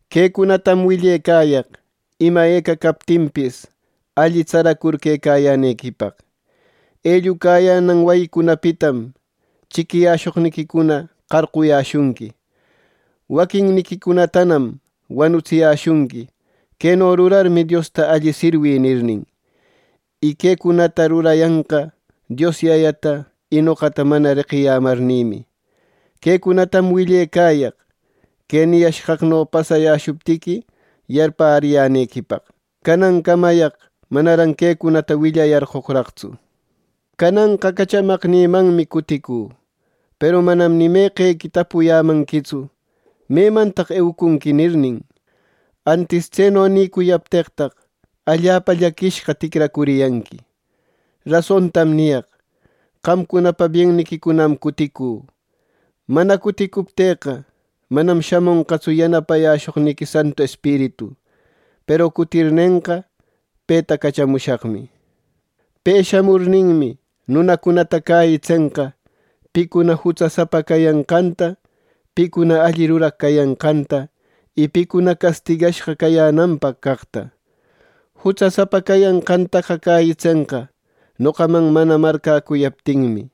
“Quecunatam willecayaq ima eca captinpis, alli tsaracur quecayänequipaq. Ellucayänan wayicunapitam chiquiyäshoqniquicuna qarquyäshunqui. Waquinniquicunatanam wanutsiyäshunqui ‘Queno rurarmi Diosta alli sirwï’ nirnin. Y quecunata rurayanqa Dios Yayata y noqata mana reqiyämarnïmi. Quecunatam willecayaq que niyashqaqno pasayäshuptiqui yarpäriyänequipaq. “Canancamayaq manaran quecunata willayarqoqraqtsu. Cananqa cachamaqnïmanmi cuticü, peru manam ni meqequi tapuyämanquitsu ‘¿Memantaq eucunqui?’ nirnin. ¡Antis tseno nicuyapteqtaq allapa llaquishqa ticracuriyanqui! Rasontam niyaq: Qamcunapa bienniquicunam cuticü. Mana cutiptëqa, manam shamonqatsu yanapayäshoqniqui Santu Espiritu. Peru cutirnenqa, peta cachamushaqmi. Pe shamurninmi, nunacunata cäyitsenqa picuna jutsasapa cayanqanta, picuna alli ruraq cayanqanta, y picuna castigashqa cayänanpaq caqta. Jutsasapa cayanqantaqa cäyitsenqa, noqaman mana marcäcuyaptinmi.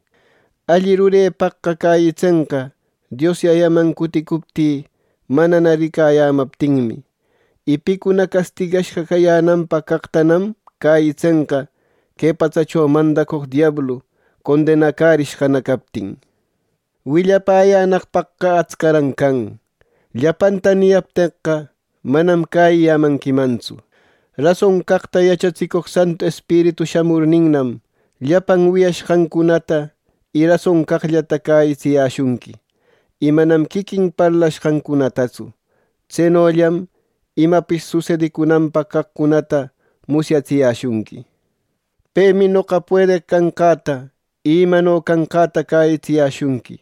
Alli rurepaqqa cäyitsenqa Dios Yayaman cuticuptï, manana ricayämaptinmi. Y picuna castigashqa cayänanpaq caqtanam cäyitsenqa que patsacho mandacoq diablu condenacärishqana captin. “Willayänaqpaqqa atscaran can. Llapanta niyapteqqa, manam cäyiyämanquimantsu. Rason caqta yachatsicoq Santu Espiritu shamurninnam, llapan wiyashqancunata y rason caqllata cäyitsiyäshunqui, y manam quiquin parlashqancunatatsu. Tsenollam imapis susedicunanpaq caqcunata musyatsiyäshunqui. Pemi noqa puedeq canqäta y imano canqäta cäyitsiyäshunqui.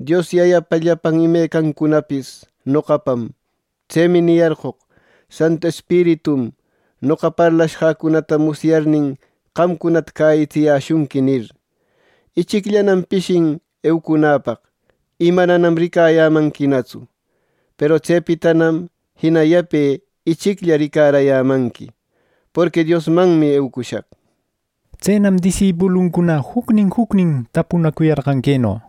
Dios Yayapa llapan imecancunapis noqapam. Tsemi niyarqoq: ‘Santu Espiritum noqa parlashqäcunata musyarnin, qamcunata cäyitsiyäshunqui’ nir. “Ichicllanam pishin eucunäpaq, y mananam ricayämanquinatsu. Peru tsepitanam jina yape ichiclla ricarayämanqui, ˻porqui Diosmanmi eucushaq˼” nir. Tsenam disipuluncuna jucnin jucnin tapunacuyarqan queno: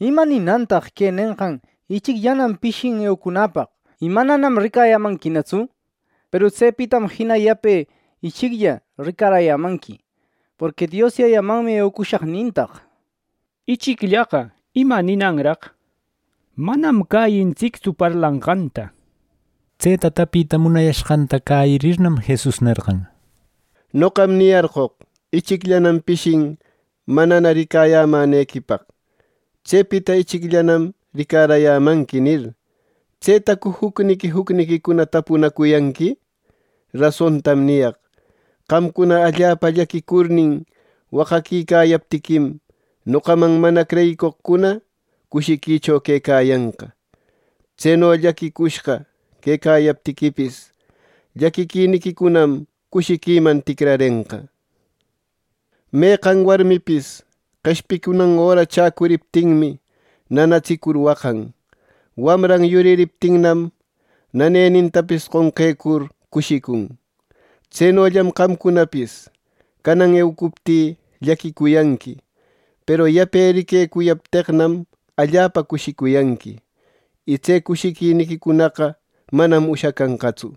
—¿Ima ninantaq que nenqan ‘Ichicllanam pishin eucunäpaq, y mananam ricayämanquinatsu. Peru tsepitanam jina yape ichiclla ricarayämanqui, porqui Dios Yayamanmi eucushaq’ nintaq? Ichicllaqa ¿ima ninanraq? Manam cäyintsictsu parlanqanta —nir. Tseta tapita munayashqanta cäyirirnam, Jesus nerqan: —Noqam niyarqoq: ‘Ichicllanam pishin manana ricayämänequipaq. Tsepita ichicllanam ricarayämanqui’ nir. ¿Tsetacu jucniqui jucniquicuna tapunaquicayanqui? Rasontam niyaq: Qamcuna allapa llaquicurnin waqaquicayaptiquim, noqaman mana creyicoqcunana cushiquicho quecayanqa. Tseno llaquicushqa quecayaptiquipis, llaquiquiniquicunam cushiquiman ticrarenqa. Meqan warmipis qeshpicunan öra chäcuriptinmi, nanatsicur waqan. Wamran yuririptinnam, nanenintapis qonqecur cushicun. Tsenollam qamcunapis canan eucuptï llaquicuyanqui. Peru yape riquecuyapteqnam, allapa cushicuyanqui, y tse cushiquiniquicunaqa manam ushacanqatsu.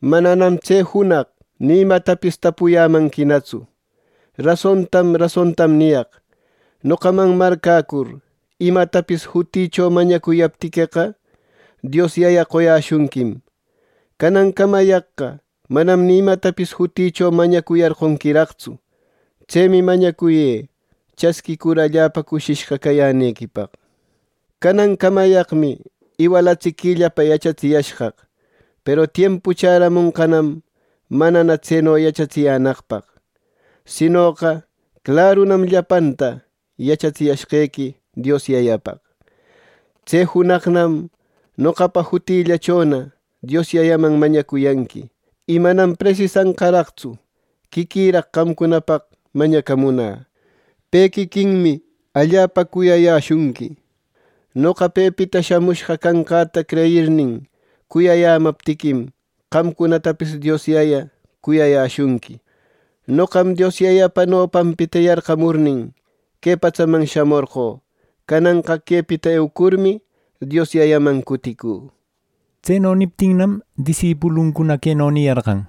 “Mananam tse junaq ni imatapis tapuyämanquinatsu. Rasontam rasontam niyaq: Noqaman marcäcur imatapis jutïcho mañacuyaptiqueqa, Dios Yaya qoyäshunquim. Canancamayaqqa manam ni imatapis jutïcho mañacuyarqonquiraqtsu. Tsemi mañacuyë chasquïcur allapa cushishqa cayänequipaq. “Canancamayaqmi iwalatsiquillapa yachatsiyashqaq, peru tiempu chäramonqanam manana tseno yachatsiyänaqpaq. Sinoqa clarunam llapanta yachatsiyashqequi Dios Yayapaq. Tse junaqcunam noqapa jutillächona Dios Yayaman mañacuyanqui. Y manam presisanqaraqtsu quiquiraq qamcunapaq mañacamunä. Pe quiquinmi allapa cuyayäshunqui. Noqa pepita shamushqa canqäta creyirnin cuyayämaptiquim, qamcunatapis Dios Yaya cuyayäshunqui. Noqam Dios Yayapa nopanpita yarqamurnin, que patsaman shamorqö. Cananqa quepita eucurmi, Dios Yayaman cuticü” nir. Tseno niptinnam disipuluncuna queno niyarqan: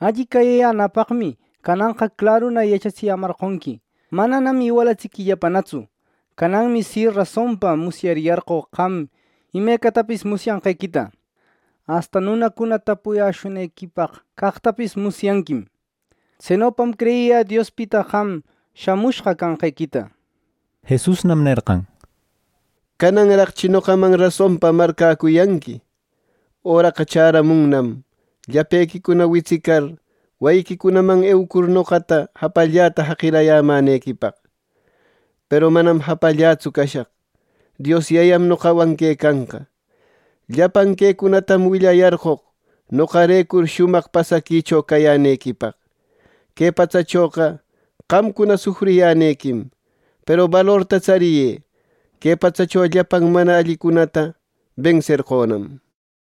—Alli cäyiyänäpaqmi cananqa claruna yachatsiyämarqonqui, mananam iwalatsiquillapanatsu. Cananmi si rasonpa musyariyarqö qam imecatapis musyanqequita. Asta nunacuna tapuyäshunequipaq caqtapis musyanquim. Tsenopam creyiyä Diospita qam shamushqa canqequita —nir. Jesusnam nerqan: —¿Cananraqchi noqaman rasonpa marcäcuyanqui! Öraqa chäramunnam, llapequicuna witsicar wayiquicunaman eucur noqata japallällata jaqirayämänequipaq. Peru manam japallätsu cashaq. Dios Yayam noqawan quecanqa. Llapan quecunatam willayarqoq noqarecur shumaq pasaquicho cayänequipaq. Que patsachoqa qamcuna sufriyänequim. Peru balorta tsariyë; que patsacho llapan mana allicunata benserqönam —nir.